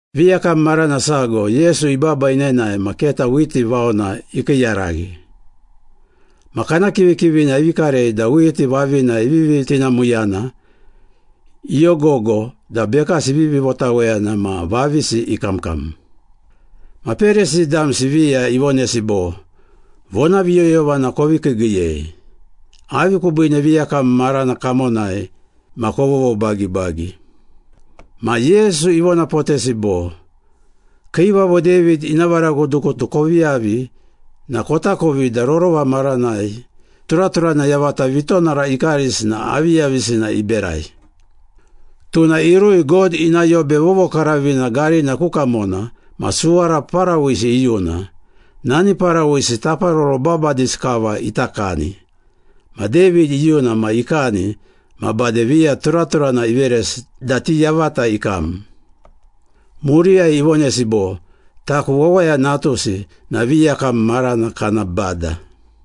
Viyakam marana sago Yesu ibaba inenae ma keta whiti vaona ikiiyaraghi. Ma kana kivikivina ivi karei da whiti vavina ivivi tinamuyana, iyogogo da bekasi ivivi votaweyana ma vavisi ikamkam. Ma Perisi damsi viya ivonesi bo, “Vonaviyoyovana kovi kiigiiyei. Avi kubiine viyakam marana kamonai ma kovovobagibagi?” Ma Yesu ivonapotesi bo, “Kiivavo David ina varagutugutu kovi yavi na kotakovi da rorova maranai turaturana yavata vitonara ikarisi na aviyavisina iberai. Tuna irui God ina Yobe Vovokaravina garina ku kamona ma suwara parawisi iyuna. Nani parawisi taparoro babadisi kava ita kani. Ma David iyuna ma ikani ma bade viya turaturana iveresi da ti yavata ikam.” Muriyai ivonesi bo, “Taku Wawaya Natusi na viyakam marana kana bada.”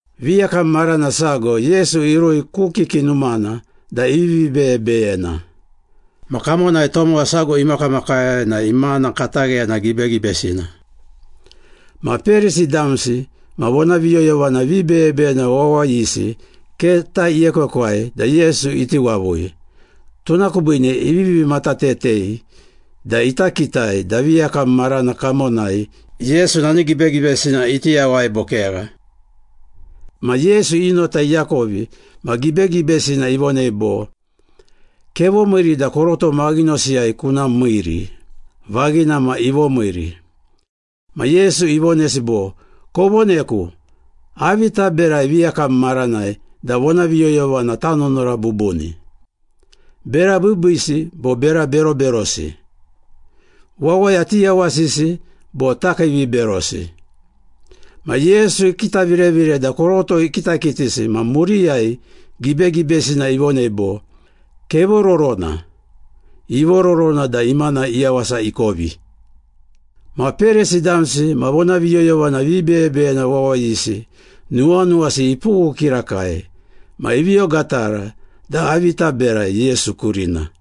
Viyakam marana sago Yesu irui ku kiki numana da ivivi beyebeyena. Ma kamonai tomowa sago imakamakai na imana katagheyana gibegibesina. Ma Perisi damsi ma vonaviyoyovana vibeyebeyena wawayisi keta iekwekwai da Yesu iti wavui, tuna kubiine ivivi matatetei da ita kitai da viyakam marana kamonai Yesu nani gibegibesina iti yawai bo kegha. Ma Yesu i nota iakovi ma gibegibesina ivonei bo, “Kevomiiri da koroto maghinosiyai kuna miiri.” Vaghina ma, ivomiiri. Ma Yesu ivonesi bo, “Kovoneku, avi taberai viyakam maranai da vonaviyoyovana tanunura bubuni? Bera biibiisi bo bera beroberosi? Wawaya tiyawasisi bo takiiviberosi?” Ma Yesu ikitavirevire da koroto ikitakitisi ma muriyai gibegibesina ivonei bo, “Kevororona.” Ivororona da imana iyawasa ikovi. Ma Perisi damsi ma vonaviyoyovana vibeyebeyena wawayisi nuwanuwasi ipughu kirakai, ma ivi ogatara da avi ita berai Yesu kurina.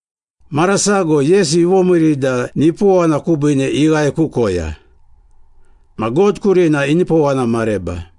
Mara sago Yesu ivomiiri da nipowana kubiine ighae ku koya. Ma God kurina inipowana mareba.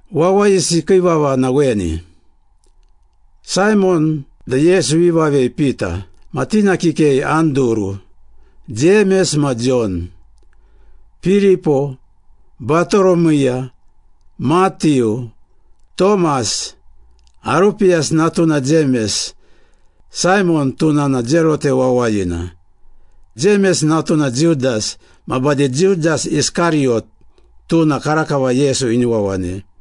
Wawayisi kii vava na weni. Saimon da Yesu ivi vavei Pita, ma tina kikei Anduru, Jemes ma Jon, Piripo, Batoromiya, Matiu, Tomas, Arupiyasi natuna Jemes, Saimon, tuna na Zelote wawayina, Jemes natuna Judas, ma bade Judas Iskariyot, tuna karakava Yesu ini wawanei.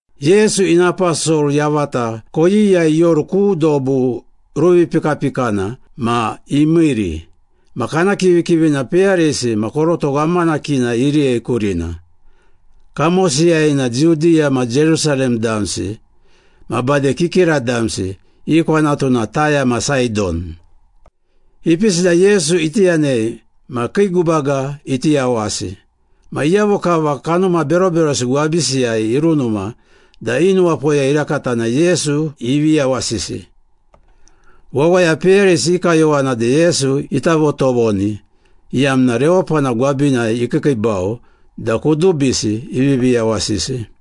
Yesu ina aposol yavata koyiyai ioru ku dobu ruvipikapikana ma imiiri. Ma kana kivikivina peyarisi ma koroto ghamanakina iriyei kurina. Kamosiyai na Judiya ma Jerusalem damsi ma bade kikira damsi, i kwanatu na Taya ma Saidon. Ipisi da Yesu iti yanei ma kii gubaga iti yawasi. Ma iyavo kava kanuma beroberosi gwabisiyai irunuma da i nuwapoya irakata na Yesu ivi yawasisi. Wawaya peyarisi i kayowana da Yesu ita votovoni, iyamna rewapana gwabinai ikiikiibau da kudubisi ivivi yawasisi.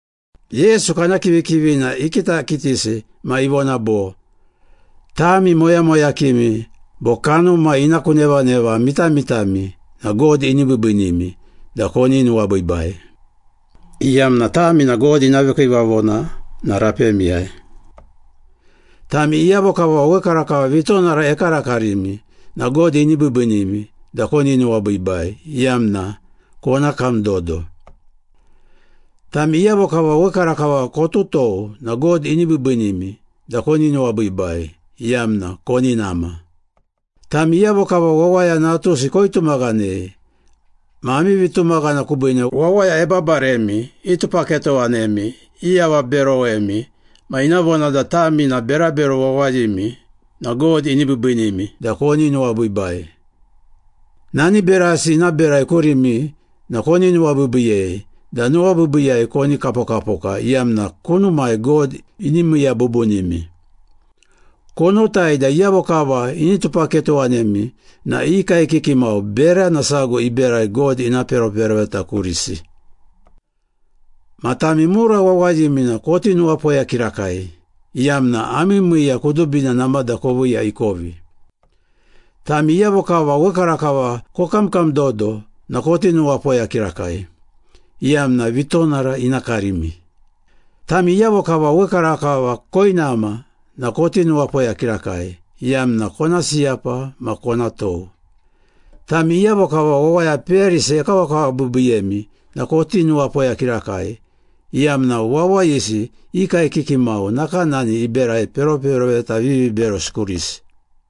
Yesu kana kivikivina ikitakitisi ma ivona bo, “Tami moyamoyakimi bo kanuma ina ku nevaneva mitamitami na God ini biibiinimi da koni nuwabiibai, iyamna tami na God ina vikiivavona na rapemiyai. Tami iyavo kava wekarakava vitonara ekarakarimi na God ini biibiinimi da koni nuwabiibai, iyamna kona kam dodo. Tami iyavo kava wekarakava kotutou na God ini biibiinimi da koni nuwabiibai, iyamna koni nama.” “Tami iyavo kava Wawaya Natusi koitumaghanei ma ami vitumaghana kubiine wawaya ebabaremi, itupaketowanemi, iavaberowemi, ma ina vona da tami na berabero wawayimi na God ini biibiinimi da koni nuwabiibai. Nani berasi ina berai kurimi na kovi nuwabiibiiyei da nuwabiibiiyai koni kapokapoka iyamna kunumai God ini miiya bubunimi. Konotai da iyavo kava ini tupaketowanemi na i kaekiki mau berana sago iberai God ina peroperoveta kurisi.” “Ma tami mura wawayimi na koti nuwapoya kirakai, iyamna ami miiya kudubina namada koviiya ikovi. Tami iyavo kava wekarakava kokamkamdodo na koti nuwapoya kirakai, iyamna vitonara ina karimi. Tami iyavo kava wekarakava koinama na koti nuwapoya kirakai, iyamna kona siyapa ma kona tou.” “Tami iyavo kava wawaya peyarisi ekawakawabiibiiyemi na koti nuwapoya kirakai, iyamna wawayisi i kaekiki mau nakanani iberai peroperoveta viviberosi kurisi.”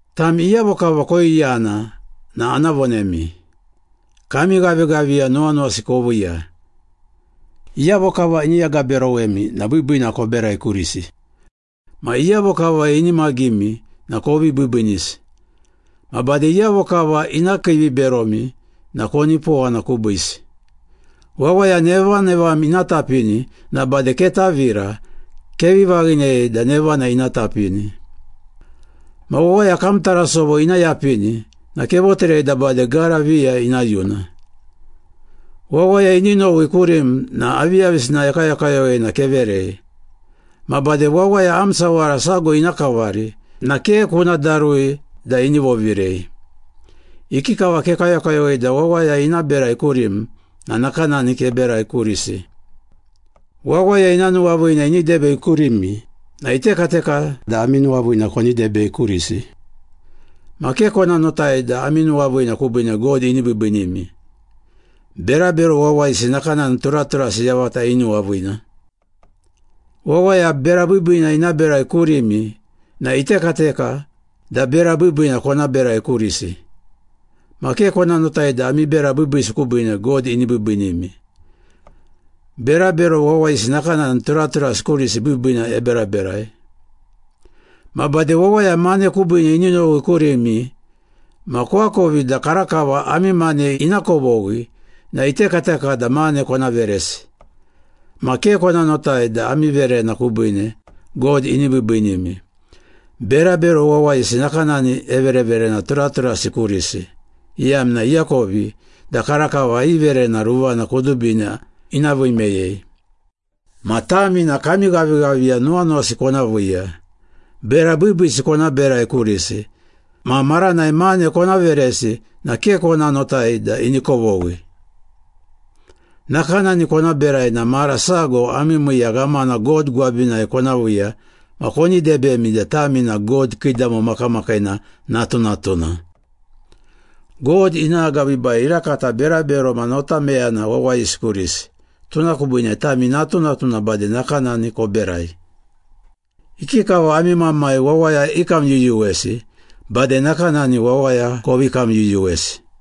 “Tami iyavo kava koiyana na ana vonemi. Kami ghavighaviya nuwanuwasi koviiya. Iyavo kava ini agaberowemi na biibiina koberai kurisi. Ma iyavo kava inimagimi na kovi biibiinisi. Ma bade iyavo kava ina kiiviberomi na konipowana kubiisi. Wawaya nevanevam ina tapini na bade ketavira, kevi vaghinei da nevana ina tapini. Ma wawaya kam tarasovo ina yapini na kevoterei da bade gara viya ina yuna. Wawaya ini nowi kurim na aviyavisina ekayokayowei na keverei. Ma bade wawaya am sawara sago ina kavari na ke kuna darui da ini vovirei. Ikikava kekayokayowei da wawaya ina berai kurim na nakanani keberai kurisi.” “Wawaya ina nuwaviina ini debei kurimi na itekateka da ami nuwaviina koni debei kurisi. Ma ke kona notai da ami nuwaviina kubiine God ini biibiinimi. Berabero wawayisi nakanani turaturasi yavata inuwaviina. Wawaya bera biibiina ina berai kurimi na itekateka da bera biibiina kona berai kurisi. Ma ke kona notai da ami bera biibiisi kubiine, God ini biibiinimi. Berabero wawayisi nakanani turaturasi kurisi biibiina eberaberai. Ma bade wawaya mane kubiine ini nowi kurimi ma koakovi da karakava ami mane ina kovoghi na itekateka da mane kona veresi. Ma ke kona notai da ami verena kubiine, God ini biibiinimi. Berabero wawayisi nakanani evereverena turaturasi kurisi, iyamna iakovi da karakava i verena ruvana kudubina ina vii meyei. Ma tami na kami ghavighaviya nuwanuwasi kona viiya, bera biibiisi kona berai kurisi, ma maranai mane kona veresi na ke kona notai da ini kovoghi. Nakanani kona berai na mara sago ami miiya ghamana God gwabinai kona viiya ma koni debemi da tami na God Kiidamo Makamakiina natunatuna. God ina agabiibai irakata berabero ma notameyena wawayisi kurisi, tuna kubiine tami natunatuna bade nakanani koberai. Ikikava ami Mamai wawaya ikamyuyuwesi, bade nakanani wawaya kovi kamyuyuwesi.”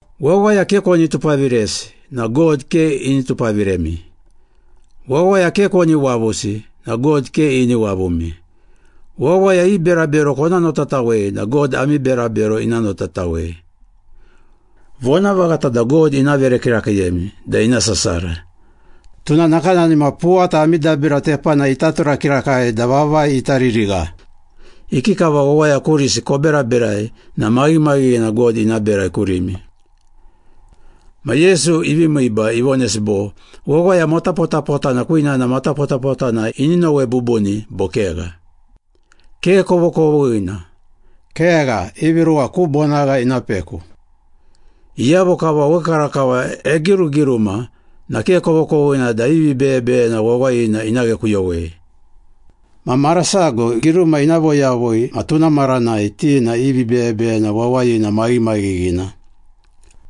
“Wawaya ke koni tupaviresi na God ke ini tupaviremi. Wawaya ke koni wavusi na God ke ini wavumi. Wawaya i berabero kona notatawei na God ami berabero ina notatawei. Kona verena ma bade God ina veremi. Vonavaghata da God ina vere kirakiiyemi da ina sasara, tuna nakanani ma puwata ami dabira tepanai ita tura kirakai da vavai ita ririgha. Ikikava wawaya kurisi koberaberai na maghimaghighina God ina berai kurimi.” Ma Yesu ivi miiba, ivonesi bo, “Wawaya matapotapotana kwinana matapotapotana ini nowe bubuni bo kegha? Ke kovokovoghina. Kegha, ivi ruwa ku bonagha ina peku. Iyavo kava wekarakava egirugiruma na ke kovokovoghina da i vibeyebeyena wawayina ina ghekuyowei. Ma mara sago giruma ina voyavui ma tuna maranai ti na i vibeyebeyena wawayina maghimaghighina.”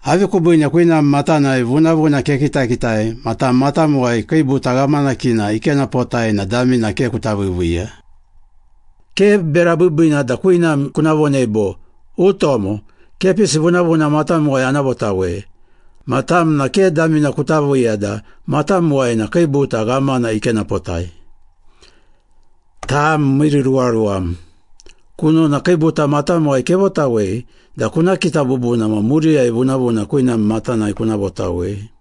“Avi kubiine kwinam matanai vunavuna kekitakitai ma tam matamuwai kiibuta ghamanakina ikenapotai na damina ke kuta viiviiya? Ke bera biibiina da kwinam kuna vonei bo, ‘Utomo, kepisi vunavuna matamuwai ana votawei,’ ma tam na ke damina kuta viiya da matamuwai na kiibuta ghamana ikenapotai. Tam miiriruwaruwam! Kunona kiibuta matamuwai kevotawei da kuna kita bubuna ma muriyai vunavuna kwinam matanai kuna votawei.”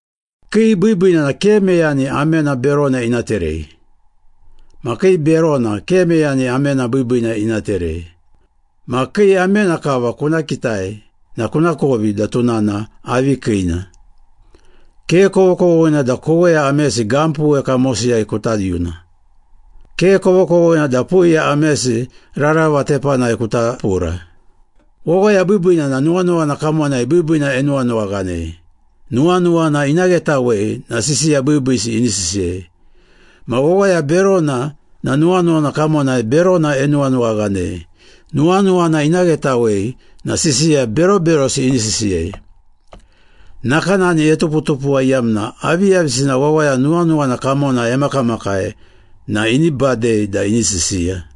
“Kii biibiina na ke meyani amena berona ina terei. Ma kii berona ke meyani amena biibiina ina terei. Ma kii amena kava kuna kitai na kunakovi da tuna na avi kiina. Ke kovokovoghina da koweya amesi gampuwe kamosiyai kuta yuna. Ke kovokovoghina da puiya amesi rarava tepanai kuta pura. Wawaya biibiina na nuwanuwana kamonai biibiina enuwanuwaghanei. Nuwanuwana ina ghetawei na sisiya biibiisi ini sisiyei. Ma wawaya berona na nuwanuwana kamonai berona enuwanuwaghanei. Nuwanuwana ina ghetawei na sisiya beroberosi ini sisiyei. Nakanani etuputupuwa iyamna aviyavisina wawaya nuwanuwana kamonai emakamakai na ini badei da ini sisiya.”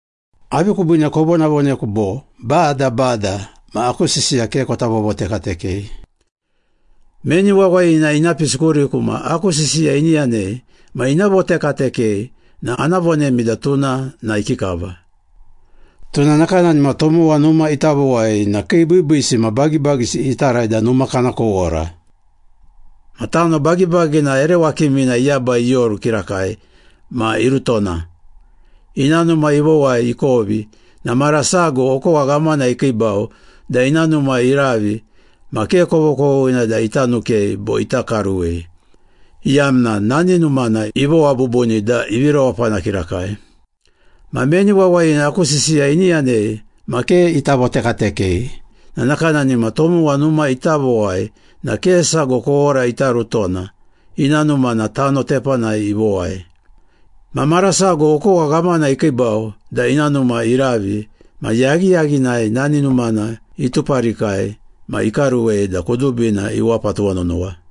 “Avi kubiine kovonavoneku bo, ‘Bada, Bada,’ ma aku sisiya ke kota vovotekatekei? Meni wawayina ina pisi kuriku ma aku sisiya ini yanei ma ina votekatekei na ana vonemi da tuna na ikikava. Tuna nakanani ma tomowa numa ita vowai na kii biibiisi ma bagibagisi itarai da numa kana kowora. Ma tano bagibagina ere wakimina iyabai ioru kirakai ma irutona. Ina numa ivowai ikovi na mara sago okowa ghamana ikiibau da ina numa iravi ma ke kovokovoghina da ita nukei bo ita karuwei, iyamna nani numana ivowa bubuni da ivi rewapana kirakai. Ma meni wawayina aku sisiya ini yanei ma ke ita votekatekei na nakanani ma tomowa numa ita vowai na ke sago kowora ita rutona, ina numa na tano tepanai ivowai. Ma mara sago okowa ghamana ikiibau da ina numa iravi ma yaghiyaghinai nani numana ituparikai ma ikaruwei da kudubina iwapa tuwanonowa.”